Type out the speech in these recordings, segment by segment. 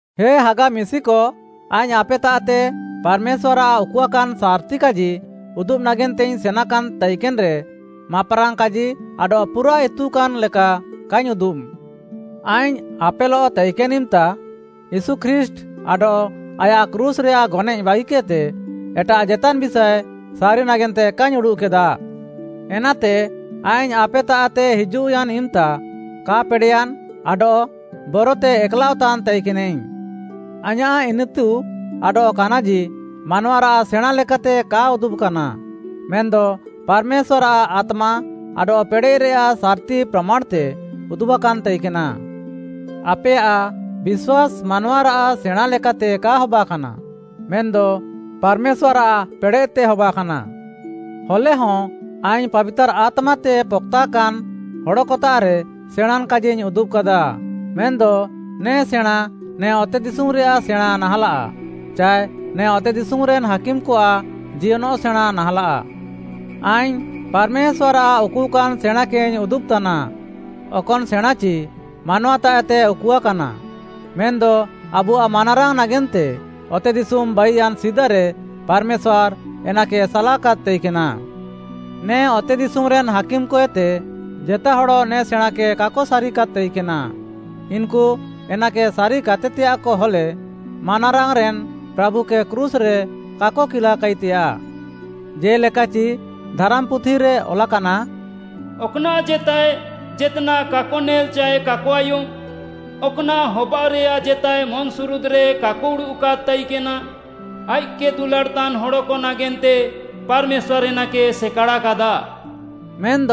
ହେ ହାଗା ମିଶିକ, ଆଇଙ୍ଗ୍‌ ଆପେତାଃତେ ପାର୍‌ମେଶ୍ୱାର୍‌ଆଃ ଉକୁଆକାନ୍‌ ସାର୍‌ତିକାଜି ଉଦୁବ୍‌ ନାଗେନ୍ତେଇଙ୍ଗ୍‌ ସେନାକାନ୍‌ ତାଇକେନ୍‌ରେ, ମାପ୍‌ରାଙ୍ଗ୍‌ କାଜି ଆଡଃ ପୁରାଃ ଇତୁକାନ୍‌ ଲେକା କାଇଙ୍ଗ୍‌ ଉଦୁବ୍‌। ଆଇଙ୍ଗ୍‌ ଆପେଲଃ ତାଇକେନ୍‌ ଇମ୍‌ତା, ୟୀଶୁ ଖ୍ରୀଷ୍ଟ୍‌ ଆଡଃ ଆୟାଃ କ୍ରୁଶ୍‌ରେୟାଃ ଗନଏଃ ବାଗିକେଦ୍‌ତେ ଏଟାଃ ଜେତାନ୍‌ ବିଷାଏ ସାରି ନାଗେନ୍ତେ କାଇଙ୍ଗ୍‌ ଉଡ଼ୁଃକେଦା। ଏନାତେ ଆଇଙ୍ଗ୍‌ ଆପେତାଃତେ ହିଜୁଃୟାନ୍‌ ଇମ୍‌ତା, କା ପେଡ଼େୟାନ୍‌, ଆଡଃ ବରତେ ଏକ୍‌ଲାଅଃତାନ୍‌ ତାଇକେନାଇଙ୍ଗ୍‌। ଆଇଁୟାଃ ଇନିତୁ ଆଡଃ କାନାଜି, ମାନୱାରାଃ ସେଣାଁଁ ଲେକାତେ କା ଉଦୁବ୍‌କାନା, ମେନ୍‌ଦ ପାର୍‌ମେଶ୍ୱାର୍‌ଆଃ ଆତ୍ମା ଆଡଃ ପେଡ଼େଃରେୟାଃ ସାର୍‌ତି ପ୍ରାମାଣ୍‌ତେ ଉଦୁବ୍‌କାନ୍‌ ତାଇକେନା। ଆପେୟାଃ ବିଶ୍ୱାସ୍‌ ମାନୱାରାଃ ସେଣାଁଁ ଲେକାତେ କା ହବାକାନା, ମେନ୍‌ଦ ପାର୍‌ମେଶ୍ୱାର୍‌ଆଃ ପେଡ଼େଃତେ ହବାକାନା। ହଲେହଁ ଆଇଙ୍ଗ୍‌ ପାବିତାର୍‌ ଆତ୍ମାତେ ପକ୍‌ତାକାନ୍‌ ହଡ଼କତାଃରେ ସେଣାଁଁନ୍‌ କାଜିଇଙ୍ଗ୍‌ ଉଦୁବ୍‌କାଦା। ମେନ୍‌ଦ ନେ ସେଣାଁଁ ନେ ଅତେଦିଶୁମ୍‌ରେୟାଃ ସେଣାଁଁ ନାହାଁଲାଃ, ଚାଏ ନେ ଅତେଦିଶୁମ୍‌ରେନ୍‌ ହାକିମ୍‌କଆଃ ଜିୟନଃ ସେଣାଁ ନାହାଁଲାଃ। ଆଇଙ୍ଗ୍‌ ପାର୍‌ମେଶ୍ୱାର୍‌ଆଃ ଉକୁଆକାନ୍‌ ସେଣାଁଁକେଇଙ୍ଗ୍‌ ଉଦୁବ୍‌ତାନା, ଅକନ୍‌ ସେଣାଁଁଚି ମାନୱାତାଃଏତେ ଉକୁଆକାନା, ମେନ୍‌ଦ ଆବୁଆଃ ମାନାରାଙ୍ଗ୍‌ ନାଗେନ୍ତେ ଅତେଦିଶୁମ୍‌ ବାଇୟାନ୍‌ ସିଦାରେ ପାର୍‌ମେଶ୍ୱାର୍‌ ଏନାକେ ସାଲାକାଦ୍‌ ତାଇକେନା। ନେ ଅତେଦିଶୁମ୍‌ରେନ୍‌ ହାକିମ୍‌କଏତେ ଜେତା ହଡ଼ ନେ ସେଣାଁଁକେ କାକ ସାରିୟାକାଦ୍‌ ତାଇକେନା। ଇନ୍‌କୁ ଏନାକେ ସାରିକାତେତେୟାଃକ ହଲେ, ମାନାରାଙ୍ଗ୍‌ରେନ୍‌ ପ୍ରାଭୁକେ କ୍ରୁଶ୍‌ରେ କାକ କିଲାକାଇତେୟାଃ। ଜେ'ଲେକାଚି, ଧାରାମ୍‌ପୁଥିରେ ଅଲାକାନା, “ଅକ୍‌ନାଃ ଜେତାଏ ଜେତ୍‌ନାଃ କାକ ନେଲ୍‌ ଚାଏ କାକ ଆୟୁମ୍‌, ଅକ୍‌ନାଃ ହବାଅଃରେୟାଃ ଜେତାଏ ମନ୍‌ସୁରୁଦ୍‌ରେ କାକ ଉଡ଼ୁଃକାଦ୍‌ ତାଇକେନା, ଆଇଃକ୍‌କେ ଦୁଲାଡ଼୍‌ତାନ୍‌ ହଡ଼କ ନାଗେନ୍ତେ ପାର୍‌ମେଶ୍ୱାର୍‌ ଏନାକେ ସେକାଡ଼ାକାଦା।” ମେନ୍‌ଦ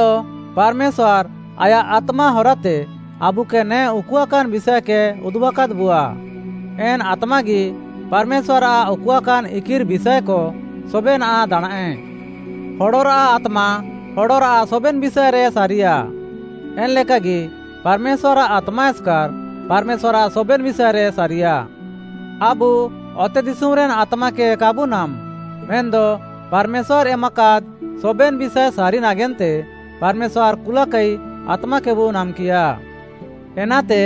ପାର୍‌ମେଶ୍ୱାର୍‌ ଆୟାଃ ଆତ୍ମା ହରାତେ ଆବୁକେ ନେ ଉକୁଆକାନ୍‌ ବିଷାଏକେ ଉଦୁବ୍‌କାଦ୍‌ବୁଆ। ଏନ୍‌ ଆତ୍ମାଗି ପାର୍‌ମେଶ୍ୱାର୍‌ଆଃ ଉକୁଆକାନ୍‌ ଇକିର୍‌ ବିଷାଏକ ସବେନାଃ ଦାଣାଁଁଏ। ହଡ଼ରାଃ ଆତ୍ମା, ହଡ଼ରାଃ ସବେନ୍‌ ବିଷାଏରେ ସାରିୟା, ଏନ୍‌ଲେକାଗି, ପାର୍‌ମେଶ୍ୱାର୍‌ଆଃ ଆତ୍ମା ଏସ୍‌କାର୍‌, ପାର୍‌ମେଶ୍ୱାର୍‌ଆଃ ସବେନ୍‌ ବିଷାଏରେ ସାରିୟା। ଆବୁ ଅତେଦିଶୁମ୍‌ରେନ୍‌ ଆତ୍ମାକେ କାବୁ ନାମ୍‌। ମେନ୍‌ଦ ପାର୍‌ମେଶ୍ୱାର୍‌ ଏମାକାଦ୍‌ ସବେନ୍‌ ବିଷାଏ ସାରି ନାଗେନ୍ତେ ପାର୍‌ମେଶ୍ୱାର୍‌ କୁଲାକାଇ ଆତ୍ମାକେବୁ ନାମ୍‌କିୟା। ଏନାତେ,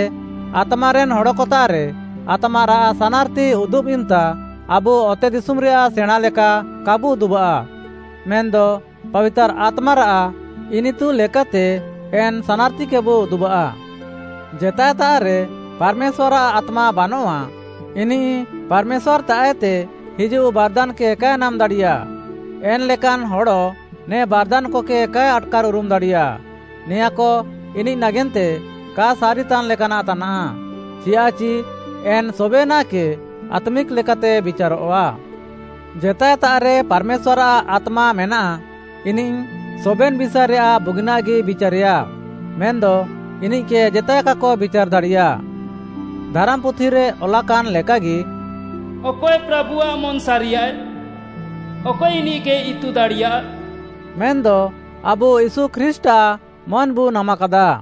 ଆତ୍ମାରେନ୍‌ ହଡ଼କତାଃରେ ଆତ୍ମାରାଃ ସାନାର୍‌ତି ଉଦୁବ୍‌ ଇମ୍‌ତା ଆବୁ ଅତେଦିଶୁମ୍‌ରେୟାଃ ସେଣାଁଁ ଲେକା କାବୁ ଉଦୁବାଃ, ମେନ୍‌ଦ ପାବିତାର୍‌ ଆତ୍ମାରାଃ ଇନିତୁ ଲେକାତେ ଏନ୍‌ ସାନାର୍‌ତିକେବୁ ଉଦୁବାଃ। ଜେତାଏତାଃରେ ପାର୍‌ମେଶ୍ୱାର୍‌ଆଃ ଆତ୍ମା ବାନଆଃ, ଇନିଃ ପାର୍‌ମେଶ୍ୱାର୍‌ତାଃତେ ହିଜୁଃ ବାର୍‌ଦାନ୍‌କେ କାଏ ନାମ୍‌ ଦାଡ଼ିୟା। ଏନ୍‌ ଲେକାନ୍‌ ହଡ଼ ନେ ବାର୍‌ଦାନ୍‌କକେ କାଏ ଆଟ୍‌କାର୍‌ଉରୁମ୍‌ ଦାଡ଼ିୟା। ନେଆଁଁକ ଇନିଃ ନାଗେନ୍ତେ କା ସାରିତାନ୍‌ ଲେକାନାଃ ତାନାଃ, ଚିୟାଃଚି ଏନ୍‌ ସବେନାଃକେ ଆତ୍ମିକ୍‌ ଲେକାତେ ବିଚାରଃଆ। ଜେତାଏତାଃରେ ପାର୍‌ମେଶ୍ୱାର୍‌ଆଃ ଆତ୍ମା ମେନାଃ, ଇନିଃ ସବେନ୍‌ ବିଷାଏରେୟାଃ ବୁଗିନାଃଗି ବିଚାରେୟା, ମେନ୍‌ଦ ଇନିଃକେ ଜେତାଏ କାକ ବିଚାର୍‌ ଦାଡ଼ିୟା। ଧାରାମ୍‌ପୁଥିରେ ଅଲାକାନ୍‌ ଲେକାଗି, “ଅକଏ ପ୍ରାଭୁଆଃ ମନ୍‌ ସାରିୟାଏ? ଅକଏ ଇନିଃକେ ଇତୁ ଦାଡ଼ିୟା?” ମେନ୍‌ଦ ଆବୁ ୟୀଶୁ ଖ୍ରୀଷ୍ଟ୍‌ଆଃ ମନ୍‌ବୁ ନାମାକାଦା।